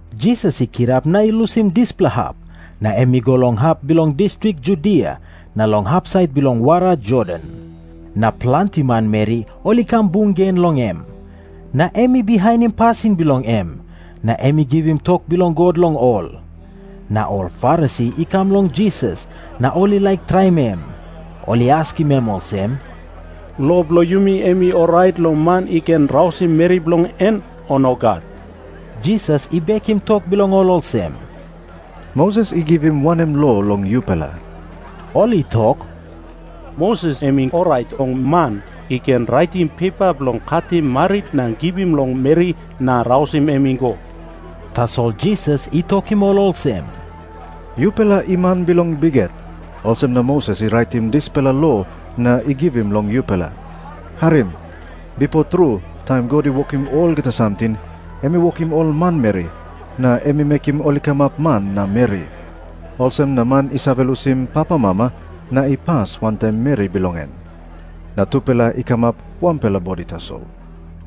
Jisas i kirap na i lusim dispela hap, na em i go long hap bilong distrik Judia na long hapsait bilong wara Jordan. Na planti manmeri ol i kam bung gen long em. Na em i bihainim pasin bilong em, na em i givim tok bilong God long ol. Na ol Farisi i kam long Jisas, na ol i laik traim em. Ol i askim em olsem, "Lo bilong yumi em I orait long man i ken rausim meri bilong en, o nogat?" Jisas i bekim tok bilong ol olsem, "Moses i givim wanem lo long yupela?" Ol i tok, "Moses em i orait long man i ken raitim pepa bilong katim marit na givim long meri na rausim em i go." Tasol Jisas i tokim ol olsem, "Yupela i man bilong bikhet, olsem na Moses i raitim dispela lo na i givim long yupela. Harim. 'Bipo tru, taim God i wokim olgeta samting, em i wokim ol manmeri na em i mekim ol i kamap man na meri. Olsem na man i save lusim papamama na i pas wantaim meri bilong en, na tupela i kamap wanpela bodi tasol.'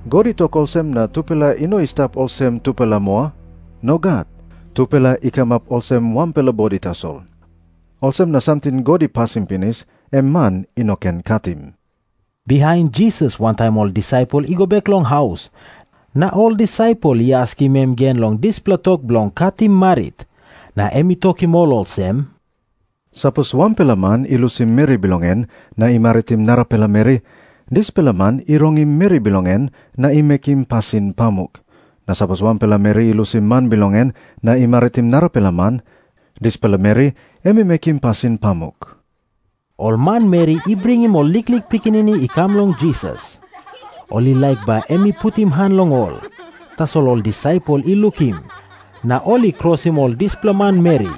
God i tok olsem na tupela i no i stap olsem tupela moa. Nogat. Tupela i kamap olsem wanpela bodi tasol. Olsem na samting God i pasim pinis, em man i no ken katim." Bihain Jisas wantaim ol disaipel i go bek long haus, na ol disaipel i askim em gen long dispela tok bilong katim marit. Na em i tokim ol olsem, "Sapos wanpela man i lusim meri bilong en na i maritim narapela meri, dispela man i rongim meri bilong en na i mekim pasin pamuk. Na sapos wanpela meri i lusim man bilong en na i maritim narapela man, dispela meri em i mekim pasin pamuk." Ol manmeri i bringim ol liklik pikinini i kam long Jisas. Ol i laik bai em i putim han long ol. Tasol ol disaipel i lukim, na ol I krosim ol dispela manmeri.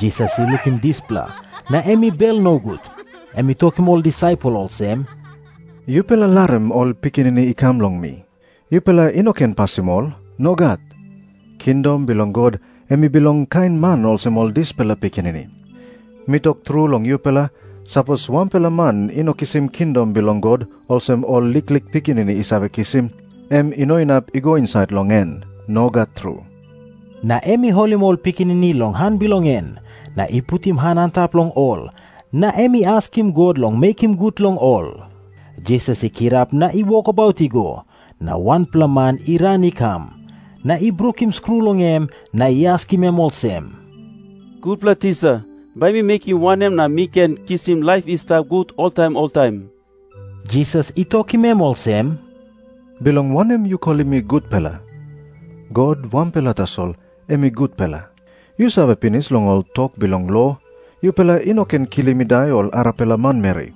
Jisas i lukim dispela, na em i bel nogut. Em i tokim ol disaipel olsem, "Yupela larim ol pikinini i kam long mi. Yupela i no ken pasim ol. Nogat. Kingdom bilong God em i bilong kain man olsem ol dispela pikinini. Mi tok tru long yupela, sapos wanpela man i no kisim kingdom bilong God olsem ol liklik pikinini i save kisim, em i no inap i go insait long en. Nogat tru." Na em i holim ol pikinini long han bilong en, na i putim han antap long ol, na em i askim God long mekim gut long ol. Jisas i kirap na i wokabaut i go, na wanpela man i ran i kam, na i brukim skru long em, na i askim em olsem, "Gutpela Tisa, bai mi mekim wanem na mi ken kisim laip i stap gut oltaim oltaim?" Jisas i tokim em olsem, "Bilong wanem yu kolim mi gutpela? God wanpela tasol em i gutpela. Yu save pinis long ol tok bilong lo. 'Yupela i no ken kilim i dai ol arapela manmeri.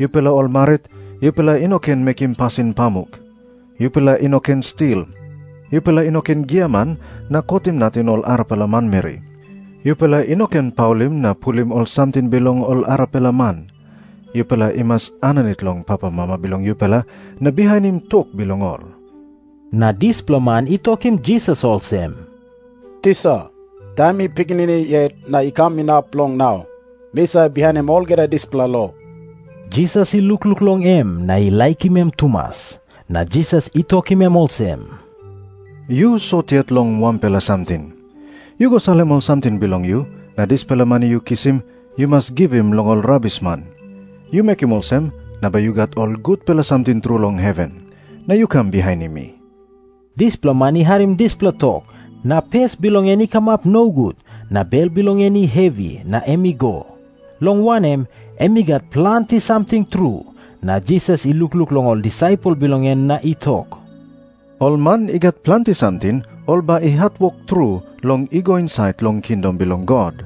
Yupela ol marit, yupela i no ken mekim pasin pamuk. Yupela i no ken stil. Yupela i no ken giaman na kotim nating ol arapela manmeri. Yupela i no ken paulim na pulim ol samting bilong ol arapela man. Yupela i mas aninit long papamama bilong yupela na bihainim tok bilong ol.' " Na dispela man i tokim Jisas olsem, "Tisa, taim mi pikinini yet na i kam inap long nau, mi save bihainim olgeta dispela lo." Jisas i lukluk long em na i laikim em tumas. Na Jisas i tokim em olsem, "Yu sot yet long wanpela samting. Yu go salim ol samting bilong yu, na dispela mani yu kisim yu mas givim long ol rabisman. Yu mekim olsem, na bai yu gat ol gutpela samting tru long heven. Na yu kam bihainim mi." Dispela man i harim dispela tok, na pes bilong en i kamap nogut, na bel bilong en i hevi, na em i go. Long wanem, em i gat planti samting tru. Na Jisas i lukluk long ol disaipel bilong en na i tok, "Ol man i gat planti samting ol bai i hatwok tru long i go insait long kingdom bilong God."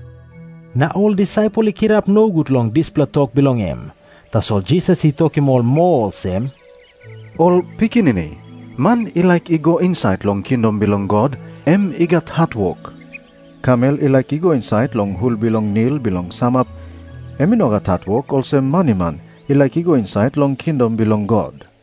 Na ol disaipel i kirap nogut long dispela tok bilong em. Tasol Jisas i tokim ol moa olsem, "Ol pikinini, man i laik i go insait long kingdom bilong God, em i gat hatwok. Kamel i laik i go insait long hul bilong nil bilong samap, em i no gat hatwok olsem maniman i laik i go insait long kingdom bilong God."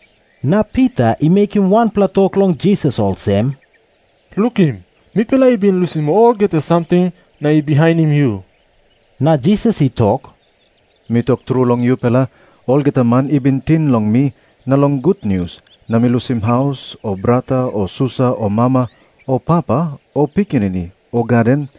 Na Pita I mekim wanpela tok long Jisas olsem, "Lukim. Mipela i bin lusim olgeta samting na i bihainim yu." Na Jisas i tok, "Mi tok tru long yupela, olgeta man i bin ting long mi na long gutnius na i lusim haus o brata o susa o mama o papa o pikinini o gaden,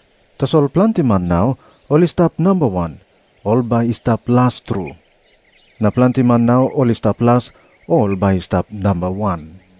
Tasol planti man nau ol i stap namba wan, ol bai i stap las tru. Na planti man nau ol i stap las, ol bai i stap namba wan."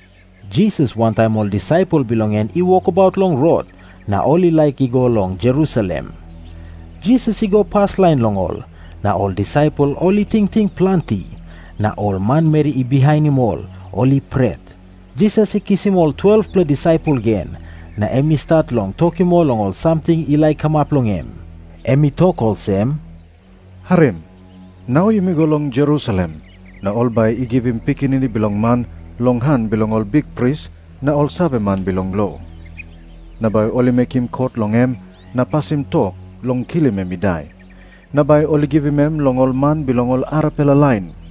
Jisas wantaim ol disaipel bilong en i wokabaut long rot na ol i laik i go long Jerusalem. Jisas i go paslain long ol. Na ol disaipel ol i tingting planti. Na ol manmeri i bihainim ol, ol i pret. Jisas i kisim ol 12-pela disaipel gen, na em i stat long tokim ol long ol samting i laik kamap long em. Em i tok olsem, "Harim. Nau yumi go long Jerusalem, na ol bai i givim Pikinini Bilong Man long han bilong ol bikpris na ol saveman bilong lo. Na bai ol i mekim kot long em na pasim tok long kilim em i dai. Na bai ol i givim em long ol man bilong ol arapela lain.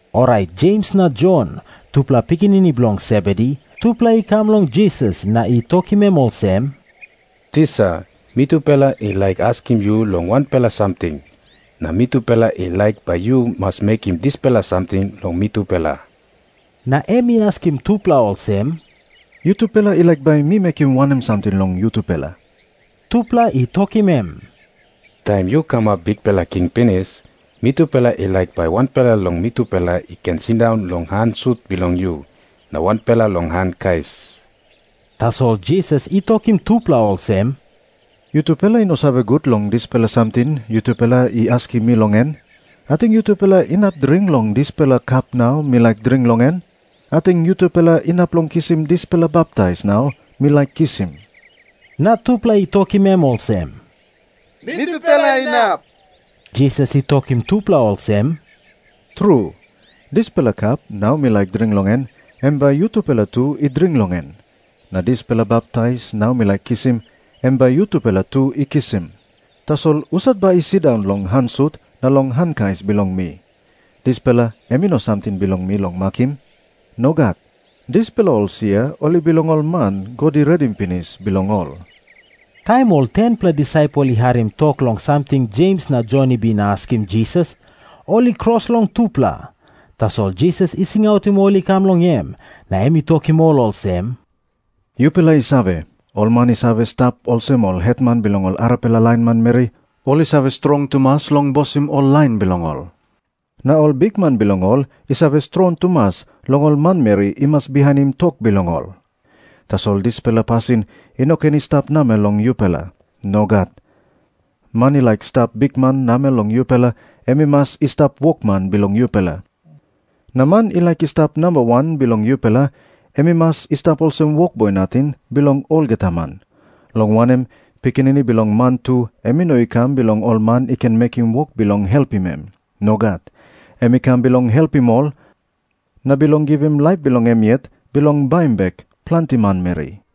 Orait Jems na Jon, tupela pikinini bilong Sebedi, tupela i kam long Jisas na i tokim em olsem, "Tisa, mitupela i laik askim yu long wanpela samting, na mitupela i laik bai yu mas mekim dispela samting long mitupela." Na em i askim tupela olsem, "Yutupela i laik bai mi mekim wanem samting long yutupela?" Tupela i tokim em, "Taim yu kamap bikpela king pinis, mitupela i laik bai wanpela long mitupela i ken sindaun long han sut bilong yu, na wanpela long han kais." Tasol Jisas i tokim tupela olsem, "Yutupela i no save gut long dispela samting yutupela i askim mi long en. Ating yutupela inap dring long dispela kap nau mi laik dring long en? Ating yutupela inap long kisim dispela baptais nau mi laik kisim?" Na tupela i tokim em olsem, "Mitupela inap." Jisas i tokim tupela olsem, "Tru, dispela kap nau mi laik dring long en, em bai yutupela tu i dring long en. Na dispela baptais nau mi laik kisim, em bai yutupela tu i kisim. Tasol husat bai i sindaun long han sut na long han kais bilong mi, dispela em i no samting bilong mi long makim. Nogat. Dispela ol sia ol i bilong ol man God i redim pinis bilong ol." Taim ol 10-pela disaipel i harim tok long samting Jems na Jon i bin askim Jisas, ol i kros long tupela. Tasol Jisas i singautim ol i kam long em, na em i tokim ol olsem, "Yupela i save, ol man i save stap olsem ol hetman bilong ol arapela lain manmeri, ol i save bosim tru ol lain bilong ol. Na ol bikman bilong ol i save strong tumas long ol manmeri i mas bihainim tok bilong ol. Tasol dispela pasin i no ken i stap namel long yupela. Nogat. Man i laik i stap bikman namel long yupela, em i mas i stap wokman bilong yupela. Na man i laik i stap namba wan bilong yupela, em i mas i stap olsem wokboi nating bilong olgeta man. Long wanem, Pikinini Bilong Man tu em i no i kam bilong ol man i ken mekim wok bilong helpim em. Nogat. Em i kam bilong helpim ol, na bilong givim laip bilong em yet bilong baim bek planti manmeri."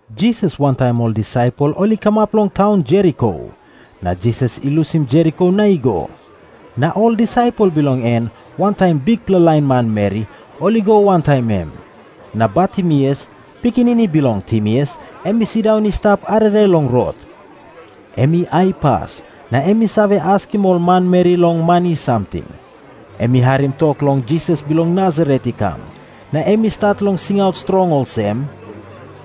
Jisas wantaim ol disaipel ol i kamap long taun Jeriko. Na Jisas i lusim Jeriko na i go. Na ol disaipel bilong en, wantaim bikpela lain manmeri, ol i go wantaim em. Na Bartimeus, pikinini bilong Timeus, em i sindaun i stap arere long rot. Em i aipas, na em i save askim ol manmeri long mani samting. Em i harim tok long Jisas bilong Nasaret i kam, na em i stat long singaut strong olsem,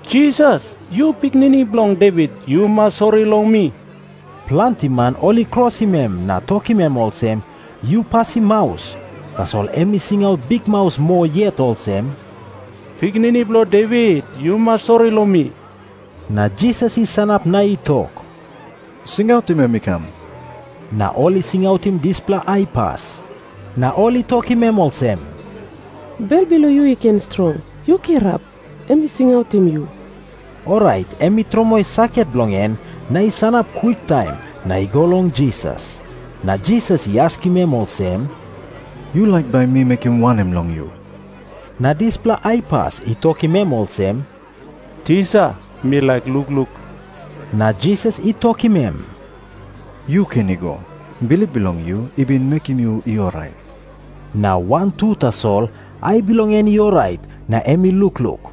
"Jisas, yu Pikinini Bilong Devit, yu mas sori long mi." Planti man ol I krosim em na tokim em olsem, "Yu pasim maus." Tasol em i singaut bikmaus moa yet olsem, "Pikinini Bilong Devit, yu mas sori long mi." Na Jisas i sanap na i tok, "Singautim em i kam." Na ol I singautim dispela aipas, Na ol I singautim dispela aipas, na ol i tokim em olsem, "Bel bilong yu i ken strong. Yu kirap. Em i singautim yu." Orait em i tromoi saket bilong en, na i sanap kwiktaim, na i go long Jisas. Na Jisas I askim em olsem, "Yu laik bai mi mekim wanem long yu?" Na dispela aipas i tokim em olsem, "Tisa, mi laik lukluk." Na Jisas i tokim em, "Yu ken i go. Bilip bilong yu i bin mekim yu i orait." Na wantu tasol ai bilong en i orait na em i lukluk.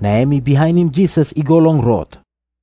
Na em i bihainim Jisas i go long rot.